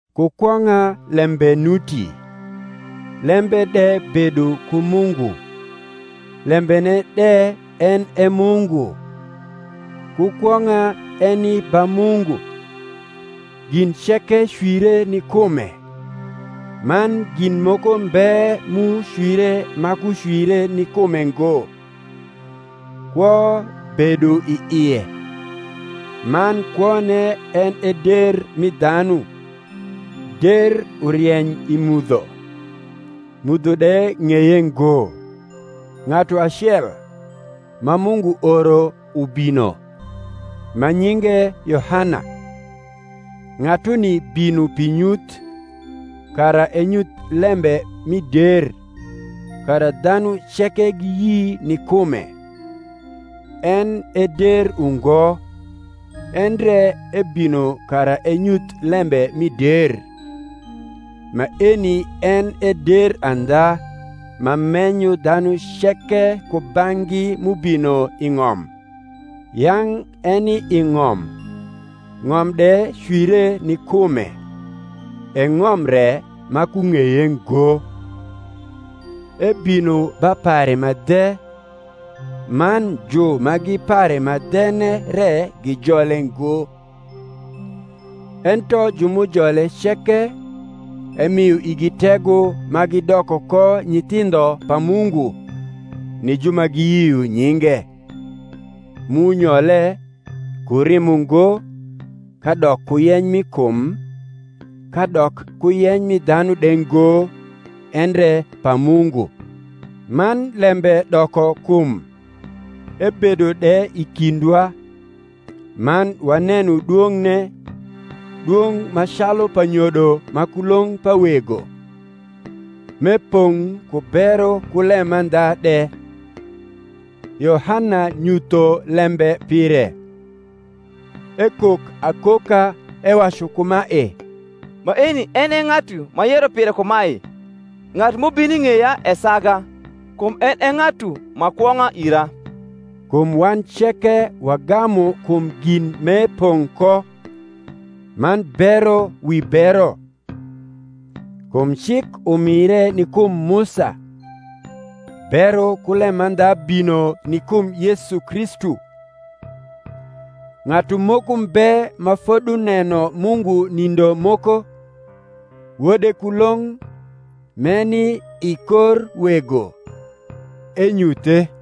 Ku kwong’a Lembe nuti, Lembe de bedo ku Mungu, Lembene de en e Mungu. Ku kwong’a eni ba Mungu. Gin ceke cwire ni kume; man gin moko mbe m’ucwire ma kucwire ni kume ngo. Kwo bedo i ie; man kwone en e der mi dhanu. Der urieny i mudho; mudho de ng’eye ngo. Ng’atu acel, ma Mungu oro ubino, ma nyinge Yohana. Ng’atuni bino pi nyuth, kara enyuth lembe mi der, kara dhanu ceke giyi ni kume. En e der ungo, endre ebino kara enyuth lembe mi der. Maeni en e der andha, ma menyo dhanu ceke kubang’gi m’ubino i ng’om. Yang’ eni i ng’om, ng’om de cwire ni kume, e ng’om re ma kung’eye ngo. Ebino ba pare ma dhe, man ju ma gi pare ma dhene re gijole ngo. Ento ju m’ujole ceke, emio igi tego ma gidoko ko nyithindho pa Mungu, ni ju ma giyio nyinge: m’unyole, ku rimo ngo, kadok ku yeny mi kum, kadok ku yeny mi dhanu de ngo, endre pa Mungu. Man Lembe doko kum, ebedo de i kindwa (man waneno dwong’ne, dwong’ ma calu pa nyodo ma kulong’ pa Wego), m’epong’ ku bero ku lemandha de. Yohana nyutho lembe pire, ekok akoka, ewacu kumae, Maeni en e ng’atu m’ayero pire kumae, Ng’atu m’ubino i ng’eya esaga: kum en e ng’atu ma kwong’a ira, kum wan ceke wagamu kum gin m’epong’ ko, man bero wi bero. Kum cik umire ni kum Musa; bero ku lemandha bino ni kum Yesu Kristu. Ng’atu moko mbe ma foduneno Mungu nindo moko; Wode kulong’, m’eni i kor Wego, enyuthe.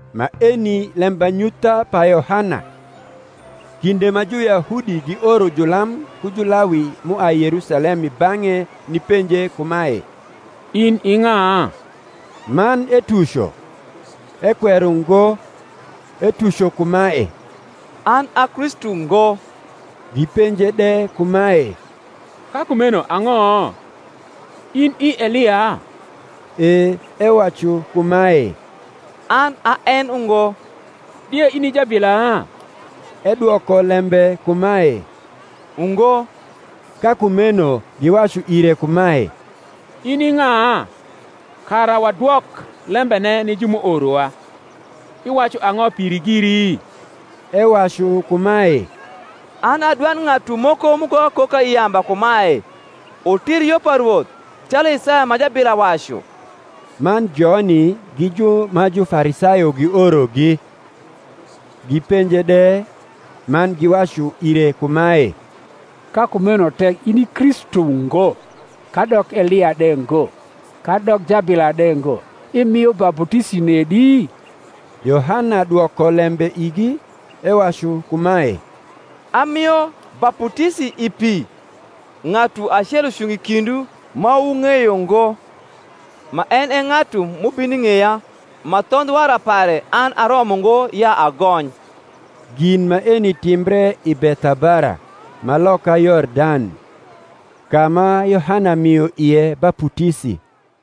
Maeni lembanyutha pa Yohana, kinde ma Juyahudi gioro julam ku Julawi m’uai Yerusalem i bang’e nipenje kumae, In i ng’a? Man etuco, ekwero ngo: etuco kumae, An a Kristu ngo. Gipenje de kumae, Ka kumeno ang’o? In i Elia? E ewacu kumae, An a en ungo. Die in i jabila? Edwoko lembe kumae, Ungo. Ka kumeno giwacu ire kumae, In i ng’a? kara wadwok lembene ni ju m’uorowa. Iwacu ang’o piri giri? Ewacu kumae, An a dwand ng’atu moko m’ukok akoka i yamba kumae, Wutir yo pa Rwoth, calu Isaya ma jabila wacu. Man joni gi ju ma Jufarisayo giorogi. Gipenje de, man giwacu ire kumae, Ka kumeno tek in i Kristu ngo, kadok Elia de ngo, kadok jabila de ngo, imio baputisi nedi? Yohana dwoko lembe igi, ewacu kumae, Amio baputisi i pi: ng’atu acel ucungo i kindwu ma wung’eyo ngo, ma en e ng’atu m’ubino i ng’eya, ma thondh wara pare an aromo ngo ya agony. Gin maeni timbre i Bethabara, ma loka Yordan, ka ma Yohana mio ie baputisi.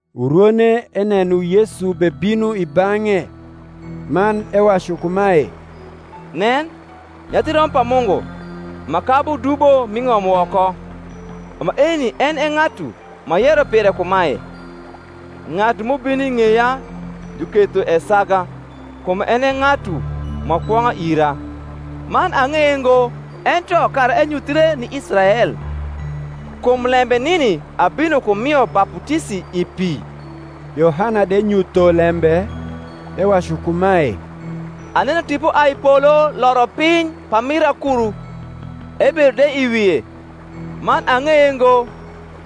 Urwone eneno Yesu bebino i bang’e, man ewacu kumae, Nen, Nyathi Rombo pa Mungu, ma kabu dubo m’i ng’om woko! Maeni en e ng’atu m’ayero pire kumae, Ng’atu m’ubino i ng’eya juketho esaga: kum en e ng’atu ma kwong’a ira. Man ang’eye ngo; ento kara enyuthre ni Israel, kum lembe nini abino ku mio baputisi i pi. Yohana de nyutho lembe, ewacu kumae, Aneno Tipo ai i polo loro piny pamir akuru; ebedo de i wie. Man ang’eye ngo: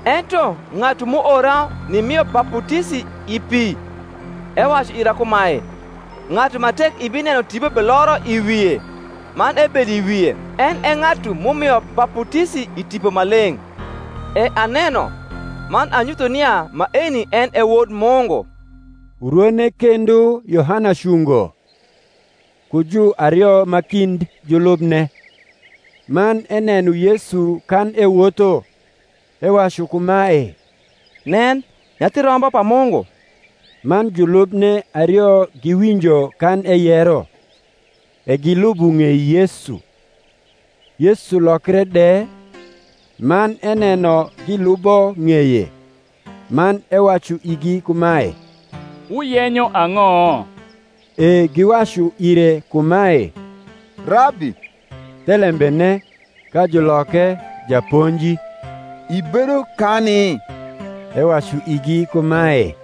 ento ng’atu m’uora nimio baputisi i pi, ewacu ira kumae, Ng’atu ma tek ibineno Tipo beloro i wie man ebedo i wie, en e ng’atu m’umio baputisi i Tipo Maleng’. E aneno, man anyutho nia maeni en e Wod Mungu. Urwone kendo Yohana cungo, ku juario ma kind julubne; man eneno Yesu kan ewotho, ewacu kumae, Nen, Nyathi Rombo pa Mungu! Man julubne ario giwinjo kan eyero, e gilubo ng’ei Yesu. Yesu lokre de, man eneno gilubo ng’eye, man ewacu igi kumae, Wuyenyo ang’o? E giwacu ire kumae, Rabbi, (thelembene, ka juloke, Japonji,) ibedo kani? Ewacu igi kumae,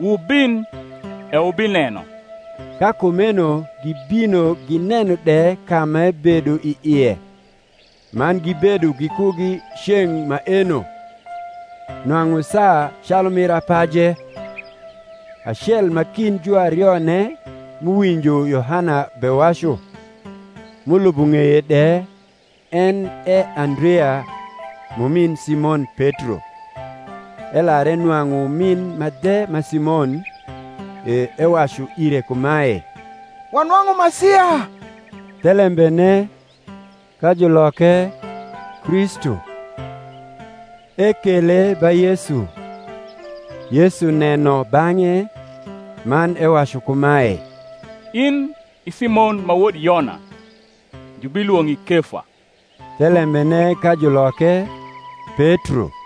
Wubin, e wubineno. Ka kumeno gibino gineno de ka m’ebedo i ie; man gibedo gikugi ceng’ maeno: nwang’u saa calu mir apaje. Acel ma kind juarione m’uwinjo Yohana bewacu, m’ulubo ng’eye de, en e Andrea, m’umin Simon Petro. Elar enwang’u umin ma dhe ma Simon, e ewacu ire kumae, Wanwang’u Masia (thelembene, ka juloke, Kristu). Ekele ba Yesu. Yesu neno bang’e, man ewacu kumae, In i Simon ma wod Yona: jubilwong’i Kefa (thelembene ka juloke, Petro).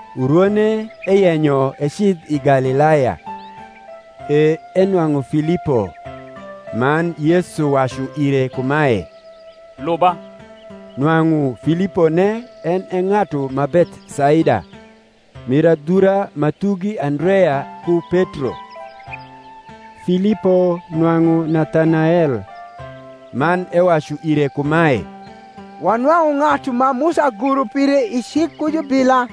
Urwone eyenyo ecidh i Galilaya, e enwang’u Filipo: man Yesu wacu ire kumae, Luba. Nwang’u Filipone en e ng’atu ma Bethsaida, mir adhura ma thugi Andrea ku Petro. Filipo nwang’u Nathanael, man ewacu ire kumae, Wanwang’u ng’atu ma Musa goro pire i cik ku jubila,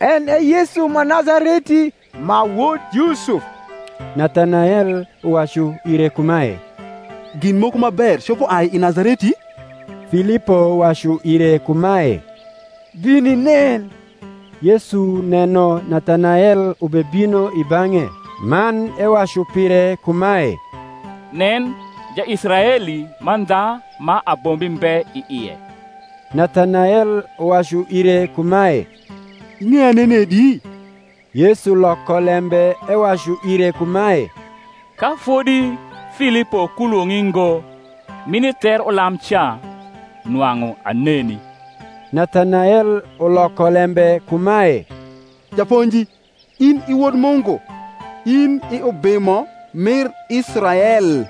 en e Yesu ma Nazareti, ma wod Yusuf. Nathanael uwacu ire kumae, Gin moko ma ber copo ai i Nazareti? Filipo wacu ire kumae, Bin inen. Yesu neno Nathanael ubebino i bang’e, man ewacu pire kumae, Nen, Jaisraeli mandha ma abombi mbe i ie! Nathanael uwacu ire kumae, Ing’eya nenedi? Yesu loko lembe ewacu ire kumae, Ka fodi Filipo kulwong’i ngo, m’ini ther ulam ca, nwang’u aneni. Nathanael uloko lembe kumae, Japonji, in i Wod Mungu; in i Ubimo mir Israel.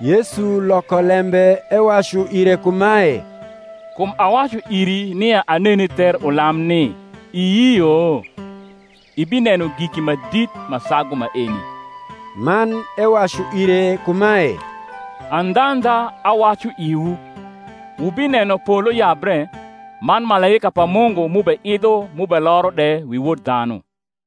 Yesu loko lembe ewacu ire kumae, Kum awacu iri nia aneni ther ulam ni, iyio? ibineno giki ma dit ma sagu maeni. Man ewacu ire kumae, Andhandha, awacu iwu, Wubineno polo yabre, man malaika pa Mungu m’ubeidho m’ubeloro de wi Wod dhanu.